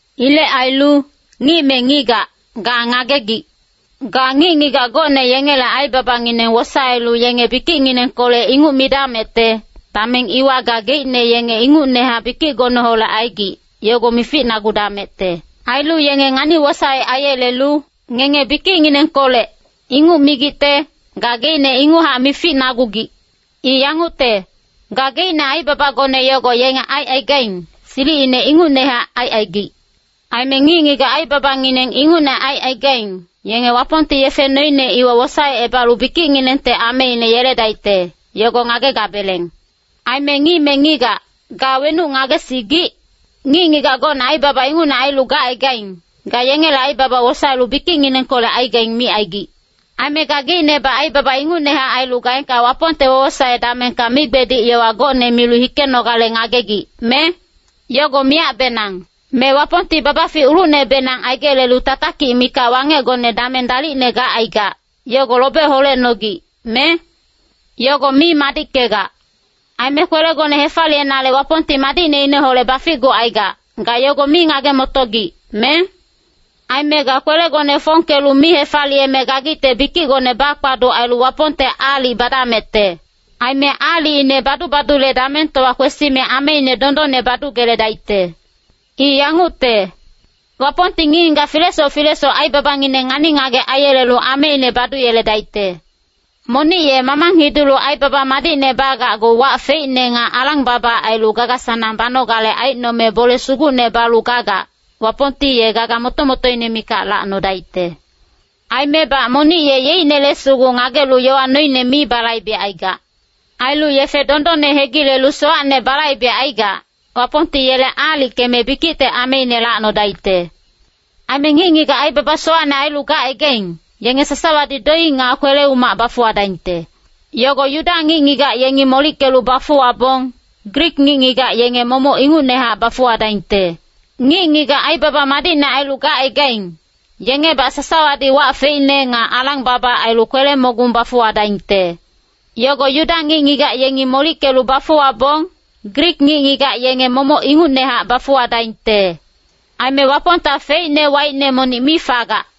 Ilec ailu, ngic me ngigac, ga ngagegic. Ga ngic-ngigac gocne yengele aibabangineng wosaelu yenge bikicnginengkolec inguc midamecte, dameng iwa gageicne yenge ingucnehac bikicgoneholec aigic, yogo mificnagudamecte. Ailu yenge ngani-wosaec aiyelelu, “Ngenge bikicnginengkolec,” inguc migicte, gageicne inguchac mificnagugic. I yangucte, gageicne aibabagone yogo yenge aicaigaing, silicine ingucnehac aicaigic. Aime ngic-ngigac aibabangineng ingucne aicaigaing, yenge Wapongti yefe noine iwa wosaecebalu bikicnginengte ameine yeledaicte, yogo ngagegabeleng. Aime ngic me ngigac, ga wenuc ngagesigic? Ngic-ngigac gocne aibaba ingucne ailu gacaigaing, ga yengele aibaba wosaelu bikicnginengkolec aigaing micaigic. Aime gageicnebac aibaba ingucnehac ailu gaengka Wapongte wowosae damengka migbedic yowa gocne milu hikenogale ngagegic, me? Yogo miyacbenang. Me Wapongti babafic ulucnebenang aigelelu tatakic mikac wangecgone dameng dalicne gacaigac, yogo lobe holecnogic, me? Yogo mi madickegac. Aime kwelegone hefaliyenale Wapongti madicneineholec baficgucaigac, ga yogo mi ngage-motogic, me? Aime ga kwelegone fongkelu mi hefaliyeme gagicte bikicgone bakpaduc ailu Wapongte aalic badamecte. Aime aalicine badu-badule damengtowa kwesime ameine dondonne badugeledaicte. I yangucte, “Wapongti ngic-ngigac filesoc filesoc aibabangineng ngani-ngagec aiyelelu ameine baduyeledaicte.” Monic ye mamang hidulu aibaba madicne bagacgu wac feicne nga alang-baba ailu gaga-sanang banogale aicnome bole sugucne balu gagac, Wapongti ye gaga moto-motoine mikac lacnodaicte. Aimebac monic ye yeicnele sugu ngagelu yowa noine mi balaibecaigac. Ailu yefe dondonne hegilelu sowacne balaibecaigac, Wapongti yele aalickeme bikicte ameine lacnodaicte. Aime ngic-ngigac aibaba sowacne ailu gacaigaing, yenge sasawadi doic nga kwele-umac bafuwadaingte. Yogo Yuda ngic-ngigac yengi molickelu bafuwabong, Grik ngic-ngigac yenge momoc ingucnehac bafuwadaingte. Ngic-ngigac aibaba madicne ailu gacaigaing, yengebac sasawadi wac feicne nga alang-baba ailu kwele-mogung bafuwadaingte. Yogo Yuda ngic-ngigac yengi molickelu bafuwabong, Grik ngic-ngigac yenge momoc ingucnehac bafuwadaingte. Aime Wapongta feicne waicne monic mi fagac.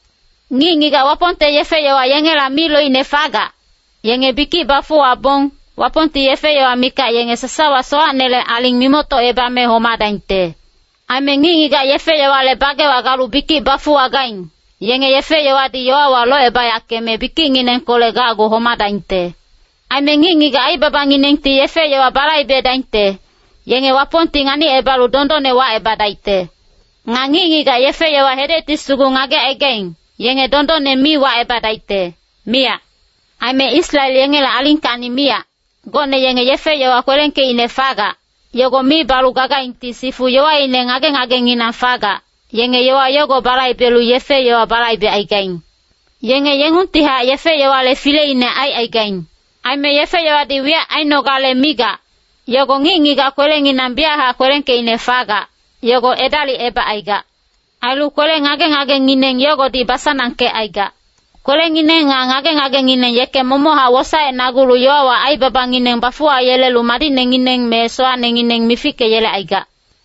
Ngic-ngigac Wapongte yefe-yowa yengela mi loicne fagac, yenge bikic bafuwabong, Wapongti yefe-yowa mikac yenge sasawa sowacnele aling mimoctocebame homadaingte. Aime ngic-ngigac yefe-yowale bagewa galu bikic bafuwagaing, yenge yefe-yowadi yowawa locebayackeme bikicnginengkolec gacgu homadaingte. Aime ngic-ngigac aibabanginengti yefe-yowa balaibedaingte, yenge Wapongti nganicebalu dondonne wacebadaicte. Nga ngic-ngigac yefe-yowa hedecti sugu ngagecaigaing, yenge dondonne mi wacebadaicte, miyac. Aime Israel yengele alingkacni miyac, gocne yenge yefe-yowa kwelengkeicne fagac, yogo mi balu gagaingti sifu yowaine ngage-ngagenginang fagac, yenge yowa yogo balaibelu yefe-yowa balaibecaigaing. Yenge yengungtihac yefe-yowale fileine aicaigaing. Aime yefe-yowadi wiyac ainogale migac, yogo ngic-ngigac kwelenginang biyachac kwelengkeicne fagac, yogo edalicebacaigac. Ailu kwele ngage-ngagengineng yogodi basanangkecaigac. Kwelengineng nga ngage-ngagengineng yeke momochac wosaecnagulu yowawa aibabangineng bafuwayelelu madicnengineng me sowacnengineng mifickeyelecaigac.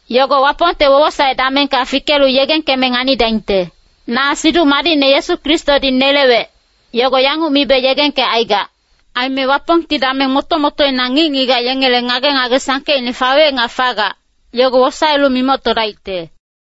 Yogo Wapongte wowosae damengka fikelu yegengkeme nganidaingte. Na Siduc Madicne Yesu Kristodi nelewec, yogo yanguc mibe yegengkecaigac. Aime Wapongti dameng moto-motoina ngic-ngigac yengele ngage-ngage sangkeicne fawec nga fagac, yogo wosaelu mimoctodaicte.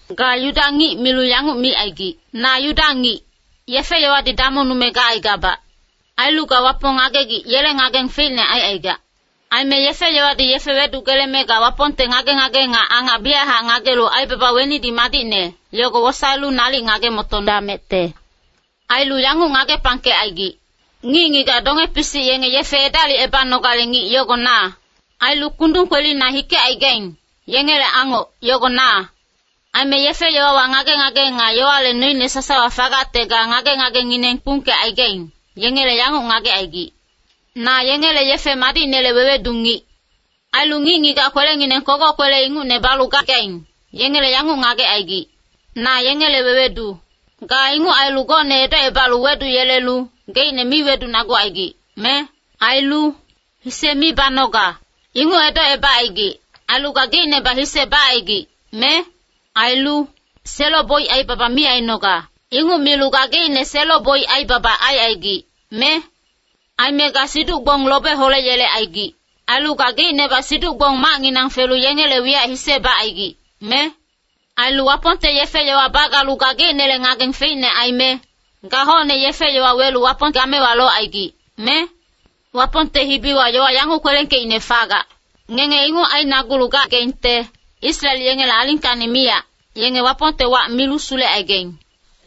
Ga Yuda ngic milu yanguc micaigic, “Na Yuda ngic, yefe-yowadi damongnume gacaigabac.” Ailu ga Wapong ngagegic yele ngageng feicne aicaigac. Aime yefe-yowadi yefe wedugeleme ga Wapongte ngage-ngage nga angac biyachac ngagelu aibaba wenidi madicne, yogo wosaelu nalic ngage-motodamecte. Ailu yanguc ngagepangkecaigic, “Ngic-ngigac donge-pisic yenge yefe edalicebanogale ngic yogo na. Ailu kundung kwelina hikecaigaing, yengele angoc, yogo na.” Aime yefe-yowawa ngage-ngage nga yowale noine sasawa fagacte ga ngage-ngagengineng kpungkecaigaing, yengele yanguc ngagecaigic, “Na yengele yefe madicnele wewedu ngic.” Ailu ngic-ngigac kwelengineng kogoc kwele ingucne balu gagaing, yengele yanguc ngagecaigic, “Na yengele wewedu.” Ga inguc ailu gocne edocebalu weduyelelu, geicne mi wedunagucaigic, me? Ailu “hise mi banoga,” inguc edocebacaigic, ailu gageicnebac hise bacaigic, me? Ailu “selo-boic aibaba mi ainoga,” inguc milu gageicne selo-boic aibaba aicaigic, me? Aime ga siduc-gbong lobe holeyelecaigic. Ailu gageicnebac siduc-gbong macnginang felu yengele wiyac hise bacaigic, me? Ailu Wapongte yefe-yowa bagalu gageicnele ngageng feicne aime, ga hocne yefe-yowa welu Wapong gamewa locaigic, me? Wapongte hibiwa yowa yanguc kwelengkeicne fagac, “Ngenge inguc ainagulu gagaingte, Israel yengele alingkacni miyac, yenge Wapongte wac milu sulecaigaing.”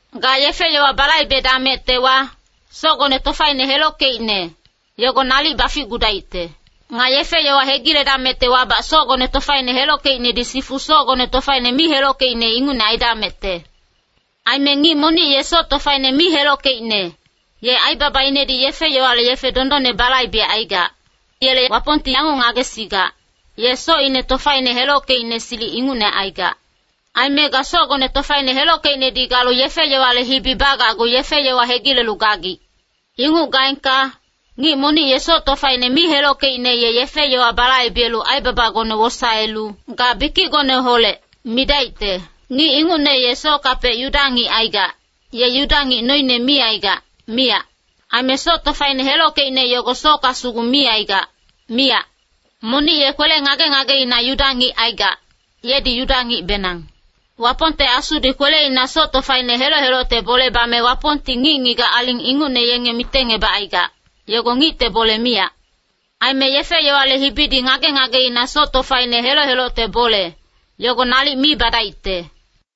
Ga yefe-yowa balaibedamectewa, socgone tofaine helockeicne, yogo nalic baficgudaicte. Nga yefe-yowa hegiledamectewabac, socgone tofaine helockeicnedi sifu socgone tofaine mi helockeicne ingucne aidamecte. Aime ngic monic ye soc tofaine mi helockeicne, ye aibabainedi yefe-yowale yefe dondonne balaibecaigac. Yele Wapongti yanguc ngagesigac, ye socine tofaine helockeicne silic ingucne aigac. Aime ga socgone tofaine helockeicnedi galu yefe-yowale hibi bagacgu yefe-yowa hegilelu gagic. Inguc gaengka, ngic monic ye soc tofaine mi helockeicne ye yefe-yowa balaibelu aibabagone wosaelu “ga bikicgoneholec” midaicte. Ngic ingucne ye sockapec Yuda ngic aigac, ye Yuda ngic noine mi aigac, miyac. Aime soc tofaine helockeicne yogo socka sugu mi aigac, miyac. Monic ye kwele ngage-ngageina Yuda ngic aigac, yedi Yuda ngicbenang. Wapongte Asudi kweleina soc tofaine heloc-helocte bole bame Wapongti ngic-ngigac aling ingucne yenge mitengebacaigac, yogo ngicte bole miyac. Aime yefe-yowale hibidi ngage-ngageina soc tofaine heloc-helocte bole, yogo nalic mi badaicte.